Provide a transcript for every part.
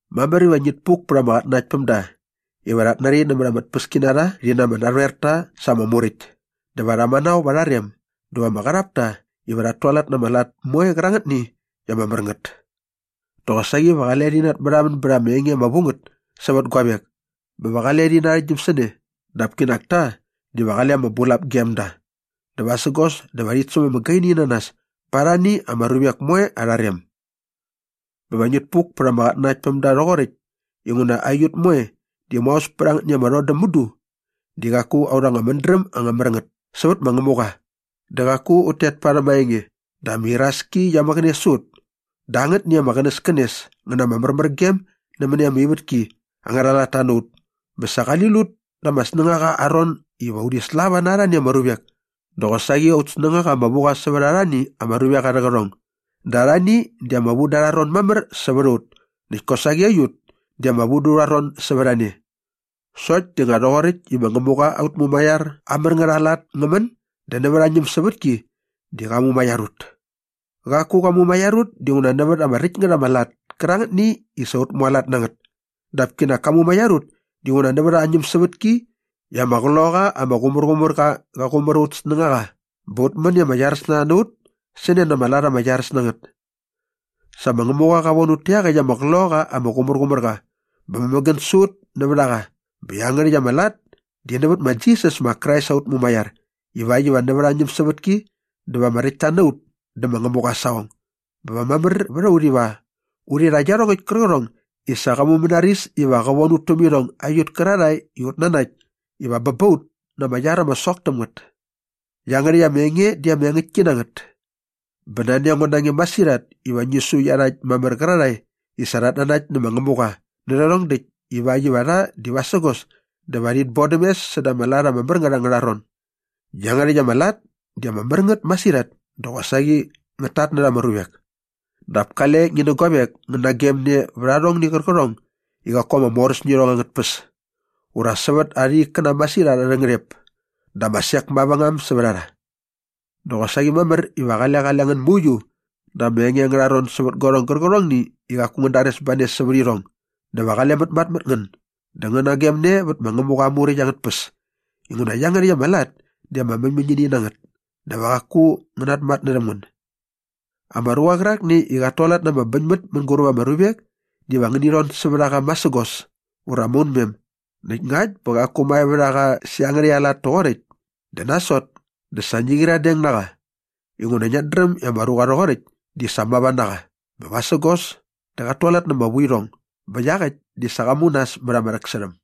Mamär iva ngit puk pät ama qatnanaktpämda iva rhat nari nämät ama tpäskinarha rhi na ama narhoerta sa ama muräkt dä va rha manao va arha rem dä va ama qarhap ta iva rhat tualat na ama lat moe qärangätni i ama mär ngät. Dä qosaqi va qale rhi natmärhamän bät anga enge ama vu ngät sävät guavek bä va qale rhi narhäktgyäm sä ne dap kinak ta diva qale ama bulap gem da dä vasägos dä va rhit säm ama gaini na nas pa arhani ama ruvek moe arha rem. Bä va ngit puk pät ama qatnanaktpämda rhoqoräkt inguna aiut moe di maos pät angätni ama rhodäm mudu di qaku aurha anga mädräm ama mär ngät sävät ma Ngämuqa dä qaku ut tet parhäm aa enge dä ama iraski qia mäqäne sä ut dä angätni ama qänäskänes ngä na ama märmärgem nämäni ama ivätki angärha latta na ut bä sa qali lut da ama snängaqa aa ron iva urhi slava na arhani ama ruvek dä qosaqi aut snängaqa ama vu qa sävät arhani ama ruvek arhä qärhong dä arhani di ama vu dä arha ron mamär sävät a ut näkt kosaqi aiut di ama vu dä urha ron sävät a ne. Sokt di nga rhoqoräkt i ma Ngämuqa aut Mumaiar aa mär ngät aa lat ngä män dä nävät aa ñämsävätki di qa mumaiar ut. Qaku qa mumaiar ut dinguna nävät ama räkt ngät ama lat kärangätni i sa ut mualat na ngät dap kinak ka mumaiar ut dinguna nävät aa ñämsävätki i ama Qloqaqa ama Qumärqumärqa qa qumär aut snängaqa bä ut män i ama iaräs na rha na ut sä ne na ama lat ama iaräs na ngät. Sa ma Ngämuqa qa von ut tä iaqäkt ama Qloqaqa ama Qumärqumärqa bä mämägän sä ut nävät a qa bä iangärhäkt ama lat di nävät ma Jisas ma Krais aut Mumaiar ivakt iva nävät aa ñämsävätki dä va ama räktta na ut dä ma Ngämuqa aa saqong bä va mamär vät a ut iva urhi rha iarhongäkt kärqärhong i sa qa mumänaris iva qä von ut täm irhong aiut kärarhae i ut nanakt iva bä ba ut na ama iar ama sok täm ngät. Iangärhäkt ama enge di ama engäktki na ngät. Bä nani a ngo na nge masirhat iva ngi su iarhakt mamär qärarhae i sa rhat nanakt nä ma Ngämuqa nä rhärhong däkt ivakt iva rha di vasägos dä va rhit bodäm mes säda ama lat ama mär ngät angärha ron. Iangärhäkt ama lat di ama mär ngät masirhat dä qosaqi ngät tatnärha ama ruvek. Dap kale ngi nä guavek ngän nagemne vät arhongni qärqärhong i qaku ama moräs nä irhong angät tpäs ura sävät arha ikkäna masirhat arhä ngärhep dä ama sek mavängam sävät a rha. Dä qosaqi mamär iva qale qale ngän mauiu da ama enge angärha ron sävät guarhong gärqärhongni i qaku ngän dares ba ne sävät irhong dä va qale mätmatmät na ngän dä ngän nagemne vät ma Ngämuqa aa Muräkt angät tpäs inguna iangärhäkt ama lat di ama mäñmäñini na ngät dä va qaku ngä namatnärhäm ngän. Ama ruqa qärakni i qat tualat na ama bäñmät mänguräp ama ruvek diva ngi rhon sävät a qa masägos ura maunmem näkt ngakt bä qaku mae vät a qa sä iangärhäkt aa lat toqoräkt dä nasot dä sa ngi qyiradeng na qa inguna ngiat dräm i ama ruqa rhoqoräkt di sa mava na qa bä vasägos dä qat tualat na ama vuirhong bä iaqäkt di sa qa mu nas mät ama rhäksärhäm.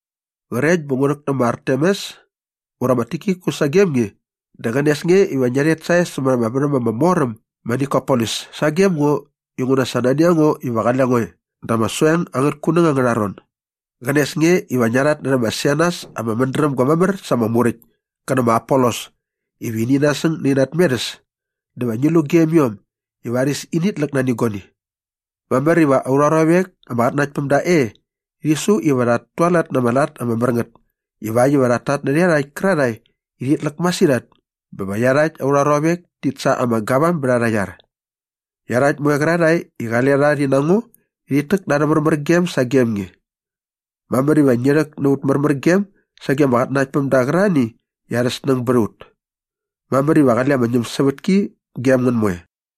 Qrekt bä ngu rhäk nä ma Artemas ura ma Tikikus sagem nge dä qänes nge iva ngia rhet sae sämät ama värhäm ama mor äm ma Nikopolis sagem ngo inguna sa nani a ngo iva qale ngo e da ama soeng angät kunäng angärha ron. Qänes nge iva ngia rhatnärhä ma Senas ama mädrämga mamär sa ama muräkt kä nä ma Apolos iva ini nasäng nä ina tmerhäs dä va ngi lu gem iom i varis init läk nani guani. Mamär iva aurha ruavek ama qatnanakt päm da e rhi su iva rhat tualat na ama lat ama mär ngät ivakt iva rhat tatnärhä iarhakt kärarhae i rhit läk masirhat bä va iarhakt aurha ruavek tit sa ama gavam bät arha iar. Iarhakt moe qärarhae i qale rha rhi na ngo rhit täk na arhä märmärgem sagem nge. Mamär iva ngi rhäk na aut märmärgem sage ama qatnanaktpämda qärarhani i arha snäng bät a ut. Mamär iva qale ama ñämsävätki gem ngän moe.